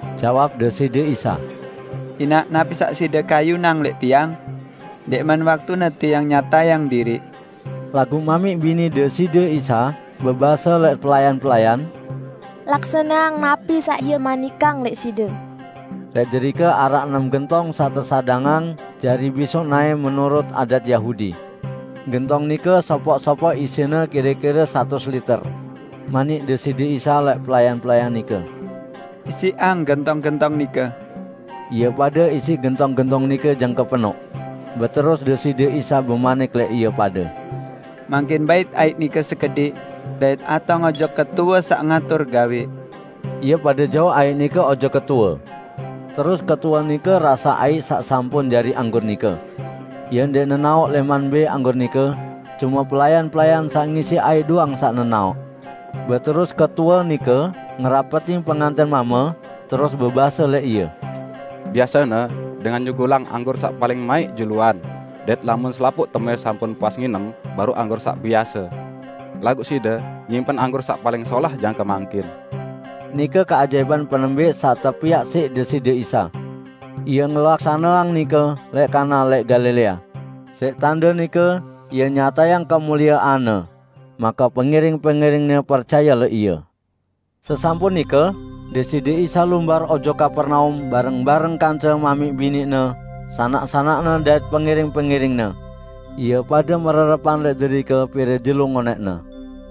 Jawab Deside Isa, "Inaq napi saq side kayunang lẽq Tiang? Ndẽqman waktune Tiang nyatayang diriq." Laguq mamiq bini Deside Isa bebase lẽq pelayan-pelayan, "Laksaneang napi saq Ie manikang lẽq side." Lẽq derike araq enem gentong saq tesadangang jari bisoq naẽ menurut adat Yahudi. Gentong nike sopoq-sopoq isine kire-kire satus liter. Manik Deside Isa lẽq pelayan-pelayan nike, "Isiqang gentong-gentong nike." Ie pade isiq gentong-gentong nike jangke penoq. Beterus Deside Isa bemanik lẽq ie pade, "Mangkin bait aiq nike sekediq dait atong ojok ketue saq ngatur gawẽ." Ie pade jauq aiq nike ojok ketue. Terus ketue nike rasaq aiq saq sampun jari anggur nike. (Ie ndẽq nenaoq lẽman mbẽ anggur nike, cume pelayan-pelayan saq ngisiq aiq doang saq nenaoq.) Beterus ketue nike ngerapetin pengantẽn mame, terus bebase lẽq ie, "Biasene dengan nyugulang anggur saq paling maiq juluan dait lamun selapuq temuẽ sampun puas nginem baruq anggur saq biase. Laguq side nyimpen anggur saq paling solah jangke mangkin!" Nike keajaipan penembẽq saq tepiaq siq Deside Isa. Ie ngelaksaneang nike lẽq Kana lẽq Galilea. Siq tande nike Ie nyatayang kemuliean-Ne. Make pengiring-pengiring-Ne percaye lẽq Ie. Sesampun nike Deside Isa lumbar ojok Kapernaum bareng-bareng kance mamiq bini-Ne, sanak-sanak-Ne dait pengiring-pengiring-Ne. Ie pade mererepan lẽq derike pire jelo ngonẽqne.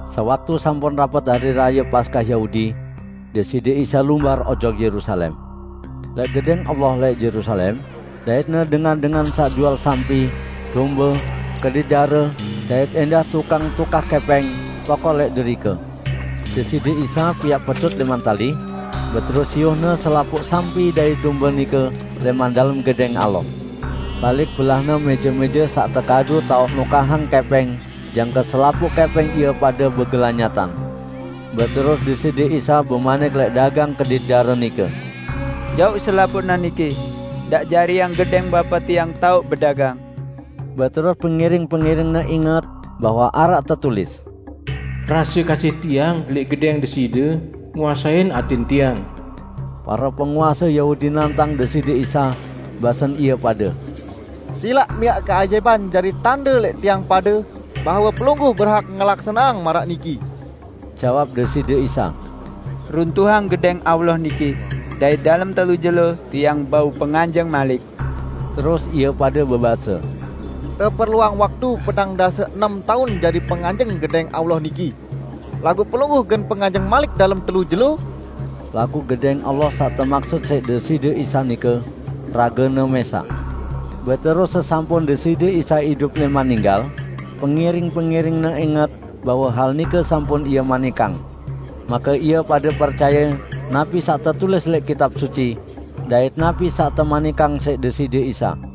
Sewaktu sampun rapet Hari Raye Paskah Yahudi, Deside Isa lumbar ojok Yerusalem. Lẽq Gedẽng Allah lẽq Yerusalem, dait-Ne dengan-dengan saq jual sampi, dombe, kedit dare; dait ẽndah tukang tukah kẽpẽng tokol lẽq derike. Deside Isa piaq pecut lẽman tali, beterus siuh-Ne selapuq sampi dait dombe nike lẽman dalem Gedẽng Allah. Balik-belah-Ne mẽje-mẽje saq tekadu taoq nukahang kẽpẽng jangke selapuq kẽpẽng ie pade begelanyatan. Beterus Deside Isa bemanik lẽq dagang kedit dare nike, "Jauq selapuqne niki. Ndaq jariang Gedẽng Bapa Tiang taoq bedagang!" Beterus pengiring-pengiring-Ne inget bahwe araq tetulis, "Rase kasih Tiang lẽq Gedẽng Deside, nguasein atẽn Tiang." Pare penguase Yahudi nantang Deside Isa, basen ie pade, "Silaq miaq keajaipan jari tande lẽq tiang pade bahwe Pelungguh berhak ngelaksaneang maraq niki." Jawab Deside Isa, "Runtuhang Gedẽng Allah niki, dait dalem telu jelo Tiang bau penganjeng malik." Terus ie pade bebase, "Teperluang waktu petang dase enem taun jari penganjeng Gedẽng Allah niki, laguq Pelungguh gen penganjeng malik dalem telu jelo?" Laguq Gedẽng Allah saq temaksut siq Deside Isa nike, rage-Ne mẽsaq. Beterus sesampun Deside Isa idup lẽman ninggal, pengiring-pengiring-Ne inget bahwe hal nike sampun Ie manikang. Make ie pade percaye napi saq tetulis lẽq Kitab Suci dait napi saq temanikang siq Deside Isa.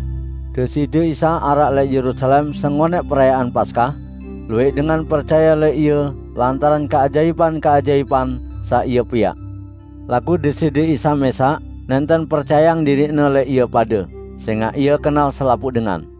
Deside Isa araq lẽq Yerusalem sengonẽq Perayaan Paskah, luwẽq dengan percaye lẽq Ie lantaran keajaipan-keajaipan saq Ie piaq. Laguq Deside Isa mẽsaq nẽnten percayeang diriq-Ne lẽq ie pade, sẽngaq Ie kenal selapuq dengan.